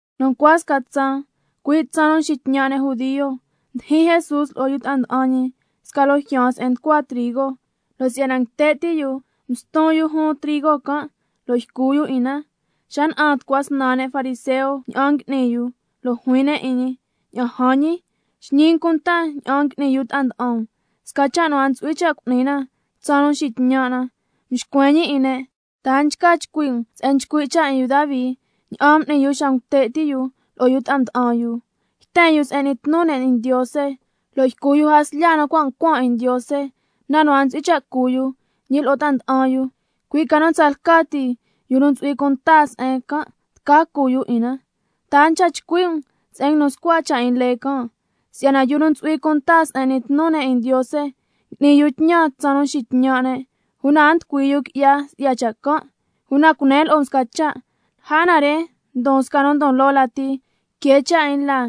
Nu ncua sca tsaan, cui' tsaan nu nxitñan' ne' judio, mdijin Jesús lo'o yu ta'a nda'an ñi sca loo jyaan se'en nducua trigo, lo' si'yana nguite' ti' yu, mston yu jun trigo can' lo' ycu yu 'in na. Xa na'an tucua snan ne' fariseo ña'an ngui'ni yu, lo' juin ne' 'in ñi: Ña'an jan ñi, xñi um cunta ña'an ngui'ni yu ta'a nda'an um, sca cha' nu a ntsu'hui cha' cu'ni na tsaan nu nxitñan' na. Mxcuen ñi 'in ne': ¿Ta a nchca chcui' um se'en nchcui' cha' 'in yu Davi ña'an m'ni yu xa ngute' ti' yu lo'o yu ta'a mda'an yu? Yten yu se'en n'ni tnu ne' 'in Ndiose, lo' ycu yu jaslya nu cua' ncuan 'in Ndiose, na nu a ntsu'hui cha' cu yu, ñi lo'o ta'a nda'an yu, cui' ca nu tsalca ti yu nu ntsu'hui cunta se'en can', tca cu yu 'in na. ¿Ta a nchca chcui' um se'en nguinu scua cha' 'in lee can', si'yana yu nu ntsu'hui cunta se'en n'ni tnu ne' 'in Ndiose ngui'ni yu tñan tsaan nu nxitñan' ne', una a nducui yu qui'ya si'ya cha' can'? Una cunen lo'o um sca cha', lja na re ndon sca nu ndon loo lati que cha' 'in laa.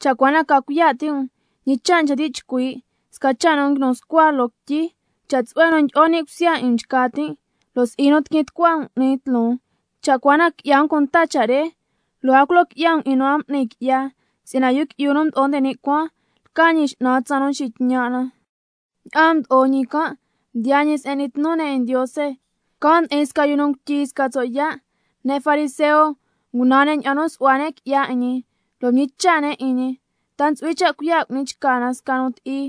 Cha' cua na ca cuiya' ti' um, ñi cha' nchca ti' chcui' sca cha' nu cua' nguinu scua loo quityi: —Cha' tsu'hue nu tyi'o ni' cusya 'in um nchca tin', lo' si'i nu tiquin tucua um 'ni tloon—. Cha' cua na qui'ya um cunta cha' re, lo' a culo qui'ya um 'in nu a m'ni qui'ya, si'yana Yu Qui'yu nu Mdo'o nde ni' Cuaan lca Ñi X'nan tsaan nu nxitñan' na. Ña'aan mdo'o ñi can' mdiyaa ñi se'en n'ni tnu ne' 'in Ndiose. Can' ndi'in sca yu nu ngutyi sca tso' yaa'. Ne' fariseo ngunan ne' ña'an nu su'hua ne' qui'ya 'in ñi, lo' mñicha' ne' 'in ñi: ¿Ta ntsu'hui cha' cuiya' cu'ni chca na sca nu ti'i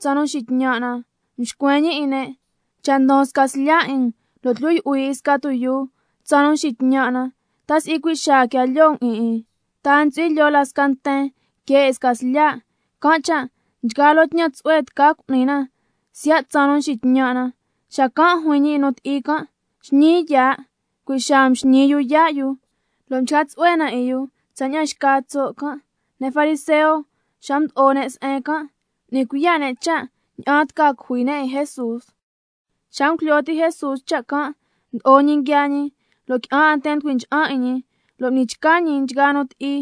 tsaan nu nxitñan' na? Mxcuen ñi 'in ne': Cha' ndon sca slya' 'in um, lo' tyu yu'hui 'in sca tuyuu tsaan nu nxitñan' na, ¿ta si'i cui' xaa quia lyoo um 'in 'in? ¿Ta a ntsu'hui lyoo la sca nten que 'in sca slya'? Can' cha' nchgaa loo tñan tsu'hue tca cu'ni na siya' tsaan nu nxitñan' na. Xacan' juin ñi 'in nu ti'i can': Xñii yaa'. Cui' xaa mxñii yu yaa' yu, lo' mchca tsu'hue na 'in yu tsaña'an xca tso' can'. Ne' fariseo xa mdyi'o ne' se'en can', m'ni cuiya' ne' cha' ña'an tca cujui ne' 'in Jesús. Xa ngujlyo ti' Jesús cha' can', mdo'o ñi nguiaa ñi, lo' qui'an 'a nten mducui ncha'an 'in ñi, lo' m'ni chca ñi 'in nchgaa nu ti'i.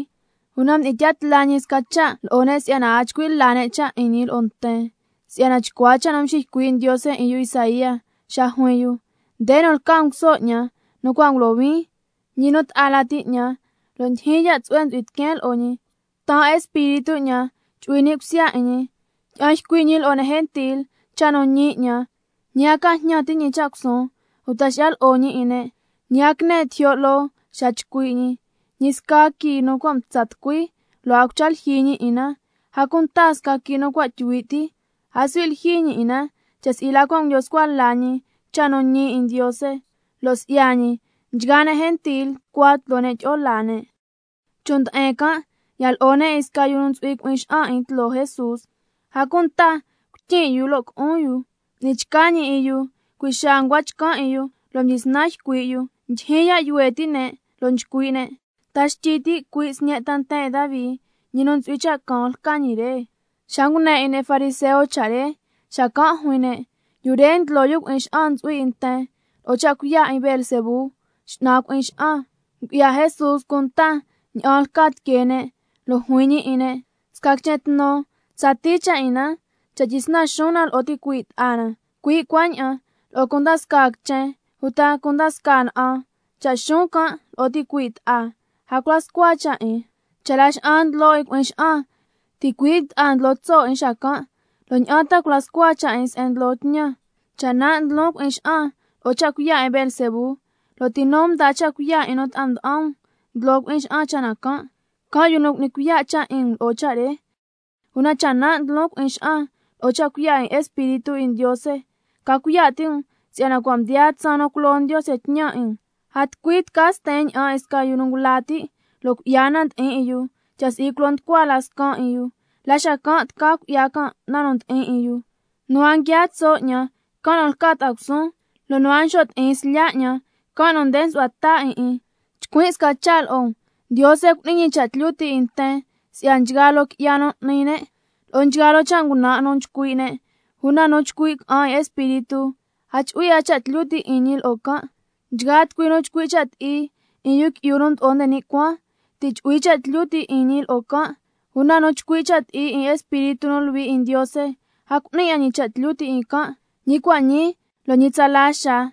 Una mdi'in tya tla ñi sca cha' lo'o ne', si'yana a chcui' la ne' cha' 'in ñi lo'o nten, si'yana chcua cha' nu mxiycui' Ndiose 'in yu Isaía xa juin yu: —Nde nu lca nguso 'ñan nu cua' ngulohuin, ñi nu ta'a lati 'ñan, lo' ndyijyin ya' tsu'hue ntsu'hui tiqueen lo'o ñi. Taan Espíritu 'ñan chu'hui ni' cusya 'in ñi. Tyi'an ycui' ñi lo'o ne' gentil cha' nu ñi 'ñan. Ñi a ca jñan ti' ñi cha' cusuun, uta xi'ya lo'o ñi 'in ne', ñi a quine tijyo' loo xa chcui' ñi. Ñi sca quii nu cua' mtsa tucui, lo' a cucha lyijyi ñi 'in na. A cunta sca quii' nu cua' tyuhui' ti, a suhui' lyijyi ñi 'in na, cha' si'i la cua' ngulyo scua la ñi cha' nu ñi 'in Ndiose, lo' si'ya ñi nchgaa ne' gentil nducua tloo ne' tyi'o laa ne'—. Chon' nde'en can' ya lo'o ne' 'in sca yu ntsu'hui cui'in xa'an 'in tloo Jesús, a cunta cuityin' yu lo' cu'un yu. M'ni chca ñi 'in yu, cui' xaa ncua chcan' 'in yu lo' mdyisnan ycui' yu. Ndyijyin ya' yuhue' ti' ne', lo' nchcui' ne': ¿Ta xtyi ti' cui' Sñe' ta nten 'in Davi, ñi nu ntsu'hui cha' caan lca ñi re? Xa ngune 'in ne' fariseo cha' re, xacan' juin ne': Yu re ndlo yu cui'in xa'an ntsu'hui 'in nten lo'o cha' cuiya' 'in Beelzebú, xñan cui'in xa'an. Ngu'ya Jesús cunta ña'an lca tiquee ne', lo' juin ñi 'in ne': Sca quichen tnu tsatii cha' 'in na cha' tyisnan xuun na lo'o ticuii' ta'a na, cui' cuaña'an lo'o cunda scaa quichen uta cunda scaa na'an, cha' nsuun can' lo'o ticuii' ta'a, a cula scua cha' 'in. Cha' Laxa'an ndlo 'in cui'in xa'an, ticuii' ta'a ndlo tso' 'in xacan'. ¿Lo' ña'an ta tca cula scua cha' 'in se'en ndlo tñan? Cha' nan' ndlon cui'in xa'an lo'o cha' cuiya' 'in Beelzebú, lo' ti nu mdaa cha' cuiya' 'in nu ta'a nda'an um ndlo cui'in xa'an cha' na can'? Can' yu nu cu'ni cuiya' cha' 'in um lo'o cha' re. Una cha' nan' ndlon cui'in xa'an lo'o cha' cuiya' 'in Espíritu 'in Ndiose, ca cuiya' ti' um si'yana cua' mdiyaa tsaan nu culo Ndiose tñan 'in um. A tucui nu tca sten ña'an 'in sca yu ngula ti' lo' cui'ya na ndi'in 'in yu, cha' si'i culo nducua la caja nu scan' 'in yu, la xacan' tca cui'ya can' na nu ndi'in 'in yu. Nu a nguiaa tso' 'ñan, can' nu lca ta'a cusuun, lo' nu a nxo' ti'in slya' 'ñan, can' nu nde nsu'hua ta 'in 'in. Chcuin' sca cha' lo'o um: Ndiose cu'ni ñi cha' tlyu ti' 'in nten si'ya nchgaa loo qui'ya nu n'ni ne', lo'o nchgaa loo cha' ngunan' nu nchcui' ne', una nu nchcui' ca'an 'in Espíritu, a chu'hui 'a cha' tlyu ti' 'in ñi lo'o can'. Nchgaa tucui nu nchcui' cha' ti'i 'in Yu Qui'yu nu Mdo'o nde ni' Cuaan, ti' chu'hui cha' tlyu ti' 'in ñi lo'o can', una nu nchcui' cha' ti'i 'in Espíritu nu Luhui 'in Ndiose, a cu'ni ñi cha' tlyu ti' 'in can', ñi cua' ñii lo' ñi tsala xaa.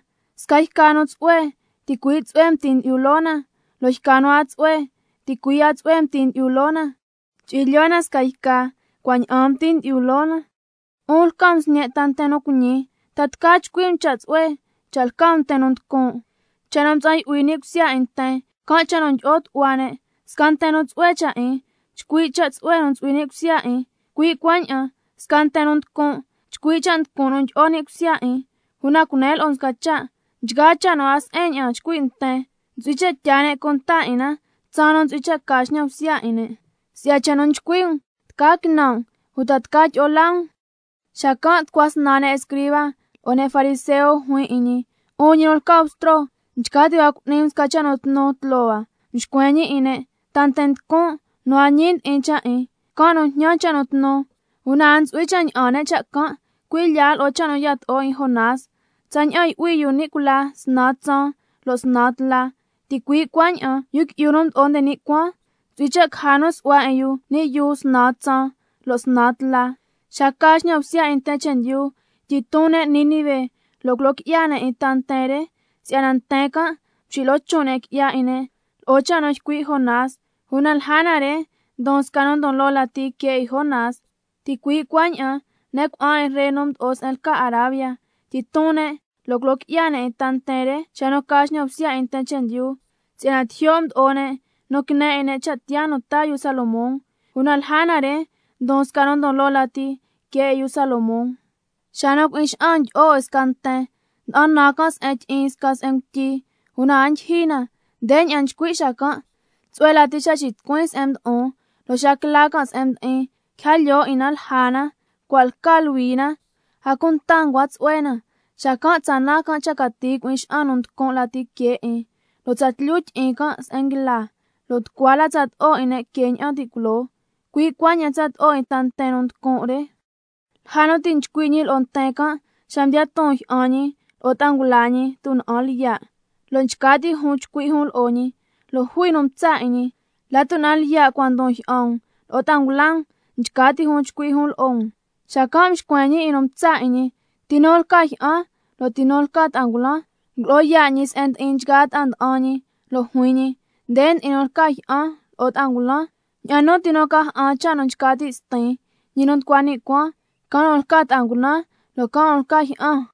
Sca yca nu tsu'hue, ticui' tsu'hue mti ndyi'yu loo na, lo' yca nu a tsu'hue, ticui' a tsu'hue mti ndyi'yu loo na. Chu'hui lyoo na sca yca cua' ña'aan mti ndyi'o loo na. ¡'Un lca um sñe' ta nten nu cuiñi! ¿Ta tca chcui' um cha' nu tsu'hue cha' lca um nten nu nducun'? Cha' nu mtsa'an yu'hui ni' cusya 'in nten, can' cha' nu ndyi'o tu'hua ne'. Sca nten nu tsu'hue cha' 'in, nchcui' cha' tsu'hue nu ntsu'hui ni' cusya 'in, cui' cuaña'an sca nten nu nducun', nchcui' cha' nducun' nu ndyi'o ni' cusya 'in. Una cunen lo'o um sca cha', nchgaa cha' nu a se'en ña'an nchcui' nten, ntsu'hui cha' tyaa ne' cunta 'in na tsaan nu ntsu'hui cha' ca xñan bsya 'in ne'. Si'ya cha' nu nchcui' um tca quinan' um uta tca tyi'o laa um. Xacan' tucua snan ne' escriba lo'o ne' fariseo juin 'in ñi: 'Un ñi nu lca Bstro, nchca ti' hua cu'ni um sca cha' nu tnu tloo hua. Mxcuen ñi 'in ne': Ta nten nducun' nu a ñi ndi'in cha' 'in, can' nu njñan scasca cha' nu tnu, una a ntsu'hui cha' ña'an ne' cha' can', cui' lya lo'o cha' nu yato'o 'in Jonás. Tsaña'an —yu'hui yu ni' cula snan tsaan lo' snan tla—, ticui' cuaña'an Yu Qui'yu nu Mdo'o nde ni' Cuaan ntsu'hui cha' caja nu su'hua 'in yu ni' yuu snan tsaan lo' snan tla. Xa ca xñan bsya 'in nten chendyu, tyiton ne' Nínive lo' culo qui'ya ne' 'in ta nten re, si'yana nten can' mxilo'o chon' ne' qui'ya 'in ne' lo'o cha' nu ycui' Jonás, una lja na re ndon sca nu ndon loo lati que 'in Jonás. Ticui' cuaña'an ne' cuna'an 'in ree nu mdo'o se'en lca Arabia, tyiton ne' lo' culo qui'ya ne' 'in ta nten re xa nu ca xñan bsya 'in nten chendyu, si'yana tijyo' mdo'o ne' nu quine 'in cha' tiyaa nu taa yu Salomón, una lja na re ndon sca nu ndon loo lati que 'in yu Salomón. Xa nu cui'in xa'an ndyi'o 'in sca nten, nda'an nan can' se'en tyi'in sca se'en ngutyi, una a ndyijyi na. Ndeña'an nchcui' xacan': Tsu'hue lati cha' xitucuin se'en mdo'on. Lo' xa quila can' se'en mdi'in, quija lyoo na 'in lja na, cua' lca luhui na, a cunta ncua tsu'hue na. Xacan' tsa nan cha cati cui'in xa'an nu nducun' lati que 'in, lo' tsatlyu tyi'in can' se'en nguila, lo' nducua la tsato'o 'in ne' que ña'an ti' culoo. Cui' cuaña'an tsato'o 'in ta nten nu nducun' re. Lja nu ti' nchcui' ñi lo'o nten can', xa mdiyaa ton jyi'an ñi lo'o ta'a ngula ñi tuna'an lyiya', lo' nchca ti' jun chcui' jun lo'o ñi. Lo' jui nu mtsa' 'in ñi: La tuna'an lyiya' cua ndon jyi'an um lo'o ta'a ngula um, nchca ti' jun nchcui' jun lo'o um. Xacan' mxcuen ñi 'in nu mtsa' 'in ñi: ¿Ti nu lca jyi'an lo' ti nu lca ta'a ngulan? Ngulo'o yaa' ñi se'en ndi'in nchgaa ta'a nda'an ñi lo' juin ñi: Nde ndi'in nu lca jyi'an lo'o ta'a ngulan. Ña'an nu ti nu ca ja'an cha' nu nchca ti' Stin, ñi nu nducua ni' cuaan, can' nu lca ta'a ngulan lo' can' nu lca jyi'an.